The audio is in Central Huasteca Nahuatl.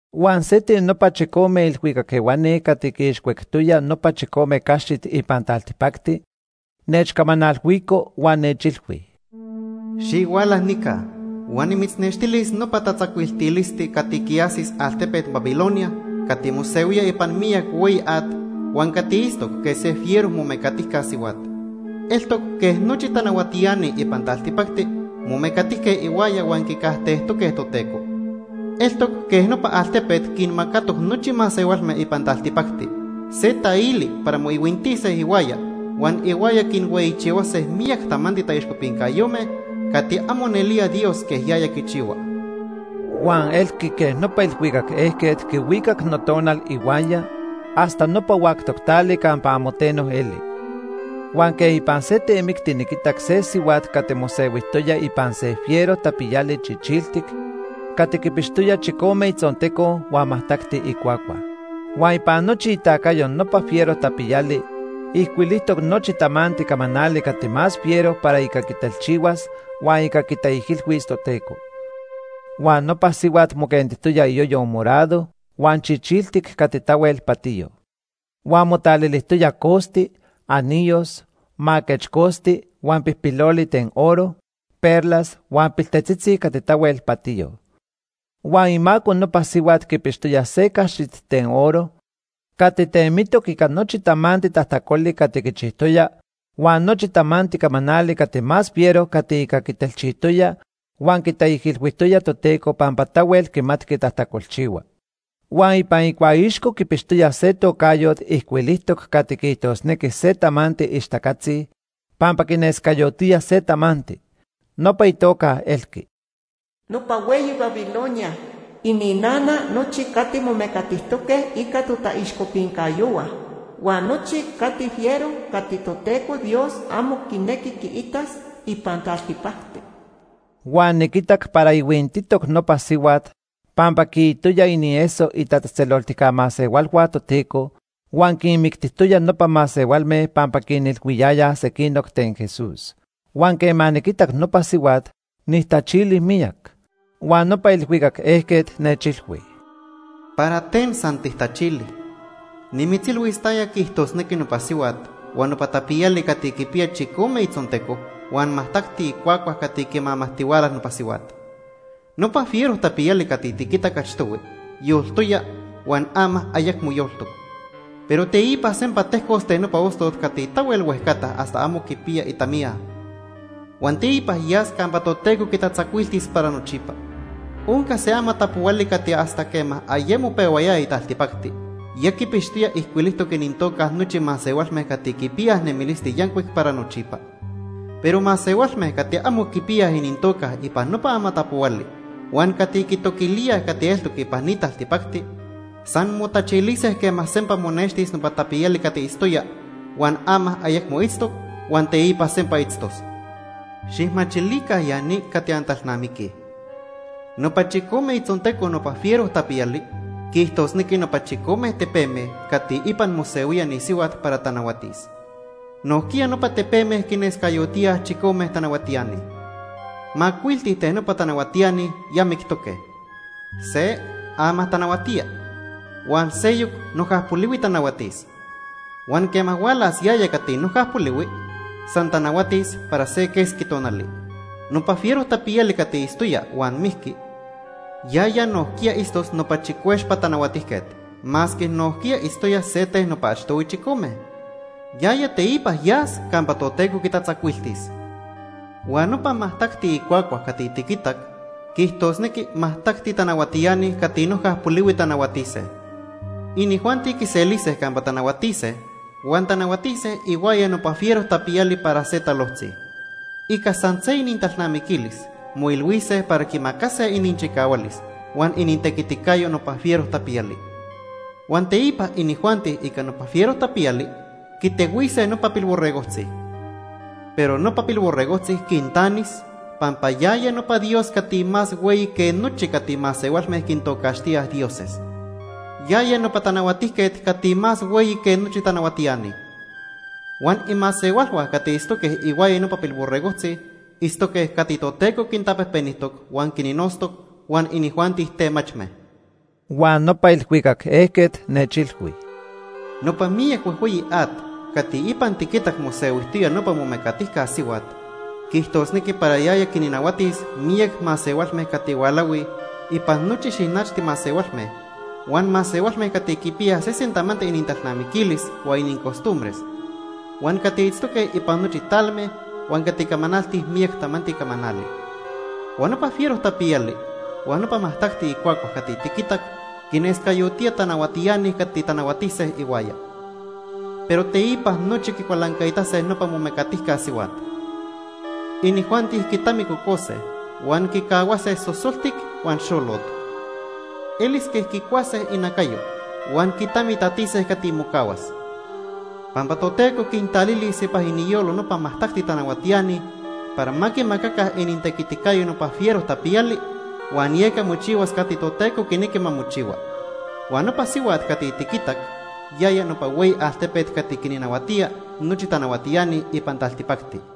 Huan se ten nopa chicome ilhuicac ehuani cati quiixcuectoya nopa chicome caxit ipan taltipacti, nechcamanalhuico huan nechilhui: “Xihuala nica huan nimitznextilis nopa tatzacuiltilisti cati quiajsis altepet Babilonia cati mosehuía ipan miyac hueyi at huan cati itztoc quej se fiero momecatijca sihuat. Eltoc quej nochi tanahuatiani ipan taltipacti momecatijque ihuaya huan quicajtejtoque Toteco. Eltoc quej nopa altepet quinmacatoc nochi masehualme ipan taltipacti se taili para moihuintise ihuaya huan ihuaya quinhueyichihuase miyac tamanti taixcopincayome cati amo nelía Dios quej yaya quichihua.” Huan elqui quej nopa ilhuicac ejquet quihuicac notonal ihuaya hasta nopa huactoc tali campa amo teno eli. Huan quej ipan se temicti niquitac se sihuat cati mosehuijtoya ipan se fiero tapiyali chichiltic cati quipixtoya chicome itzonteco huan majtacti icuacua. Huan ipan nochi itacayo nopa fiero tapiyali ijcuilijtoc nochi tamanti camanali cati más fiero para ica quitelchihuas huan ica quitaijilhuis Toteco. Huan nopa sihuat moquentijtoya iyoyo morado huan chichiltic cati tahuel patiyo. Huan motalilijtoya costi, anillos, maquechcosti huan pijpiloli ten oro, perlas huan piltetzitzi cati tahuel patiyo. Huan imaco nopa sihuat quipixtoya se caxit ten oro cati temitoc ica nochi tamanti tajtacoli cati quichijtoya huan nochi tamanti camanali cati más fiero cati ica quitelchijtoya huan quitaijilhuijtoya Toteco pampa tahuel quimatqui tajtacolchihua. Huan ipan icuaixco quipixtoya se tocayot ijcuilijtoc cati quiijtosnequi se tamanti ixtacatzi pampa quinescayotía se tamanti. Nopa itoca elqui: “Nopa hueyi Babilonia, ininana nochi cati momecatijtoque ica totaixcopincayohua, huan nochi cati fiero cati Toteco Dios amo quinequi quiitas ipan taltipacti.” Huan niquitac para ihuintitoc nopa sihuat pampa quiitoya inieso itatzejtzeloltica masehualhua Toteco huan quinmictijtoya nopa masehualme pampa quinilhuiyayaj sequinoc ten Jesús. Huan quema niquitac nopa sihuat, nijtachili miyac. Huan nopa ilhuicac ejquet nechilhui: “¿Para ten tijtachili? Nimitzilhuis taya quiijtosnequi nopa sihuat huan nopa tapiyali cati quipiya chicome itzonteco huan majtacti icuacua cati quimamajtihuala nopa sihuat. Nopa fiero tapiyali cati tiquitac achtohui yoltoya huan ama ayecmo yoltoc. Pero teipa sempa tejcos ten nopa ostot cati tahuel huejcata hasta amo quipiya itamiya. Huan teipa yas campa Toteco quitatzacuiltis para nochipa. Onca se amatapohuali cati hasta quema ayemo pehuayaya taltipacti ya quipixtoya ijcuilijtoc inintoca nochi masehualme cati quipiyaj nemilisti yancuic para nochipa. Pero masehualme cati amo quipiyaj inintoca ipan nopa amatapohuali huan cati quitoquilíaj cati eltoc ipan ni taltipacti motachilise quema sempa monextis nopa tapiyali cati itztoya, huan ama ayecmo itztoc, huan teipa sempa itztos. “Xijmachilica ya ni cati antalnamiquij. Nopa chicome itzonteco nopa fiero tapiyali quiijtosnequi nopa chicome tepeme cati ipan mosehuía ni sihuat para tanahuatis. Nojquiya nopa tepeme quinescayotíaj chicome tanahuatiani. Macuilti ten nopa tanahuatiani ya mictoque, se ama tanahuatía huan seyoc noja polihui tanahuatis. Huan quema hualas yaya cati noja polihui, san tanahuatis para se quesqui tonali. Nopa fiero tapiyali cati itztoya huan mijqui, yaya nojquiya itztos nopa chicuexpa tanahuatijquet, masque nojquiya itztoya se ten nopa achtohui chicome. Yaya teipa yas campa Toteco quitatzacuiltis. “Huan nopa majtacti icuacua cati tiquitac quiijtosnequi majtacti tanahuatiani cati noja polihui tanahuatise. Inijuanti quiselise campa tanahuatise huan tanahuatise ihuaya nopa fiero tapiyali para se talojtzi. Ica san se inintalnamiquilis moilhuise para quimacase ininchicahualis huan inintequiticayo nopa fiero tapiyali. Huan teipa inijuanti ica nopa fiero tapiyali quitehuise nopa Pilborregojtzi. Pero nopa Pilborregojtzi quintanis pampa yaya nopa Dios cati más hueyi que nochi cati masehualme quintocaxtíaj dioses. Yaya nopa Tanahuatijquet cati más hueyi que nochi tanahuatiani. Huan imasehualhua cati itztoque ihuaya nopa Pilborregojtzi itztoque cati Toteco quintapejpenijtoc huan quinnotztoc, huan inijuanti temachme.” Huan nopa ilhuicac ejquet nechilhui: “Nopa miyac huejhueyi at cati ipan tiquitac mosehuijtoya nopa momecatijca sihuat quiijtosnequi para yaya quinnahuatis miyac masehualme cati hualahui ipan nochi xinachti masehualme, huan masehualme cati quipiyaj sesen tamanti inintalnamiquilis huan inincostumbres, huan cati itztoque ipan nochi talme, huan cati camanaltij miyac tamanti camanali. Huan nopa fiero tapiyali huan nopa majtacti icuacua cati tiquitac quinescayotía tanahuatiani cati tanahuatise ihuaya. Pero teipa nochi quicualancaitase nopa momecatijca sihuat. Inijuanti quitamicocose huan quicahuase sosoltic huan xolot. Elis quej quicuase inacayo huan quitamitatise cati mocahuas. Pampa Toteco quintalilis ipan iniyolo nopa majtacti tanahuatiani para ma quimacaca inintequiticayo nopa fiero tapiyali, huan yeca mochihuas cati Toteco quinequi ma mochihua. Huan nopa sihuat cati tiquitac yaya nopa hueyi altepet cati quinnahuatía nochi tanahuatiani ipan taltipacti.”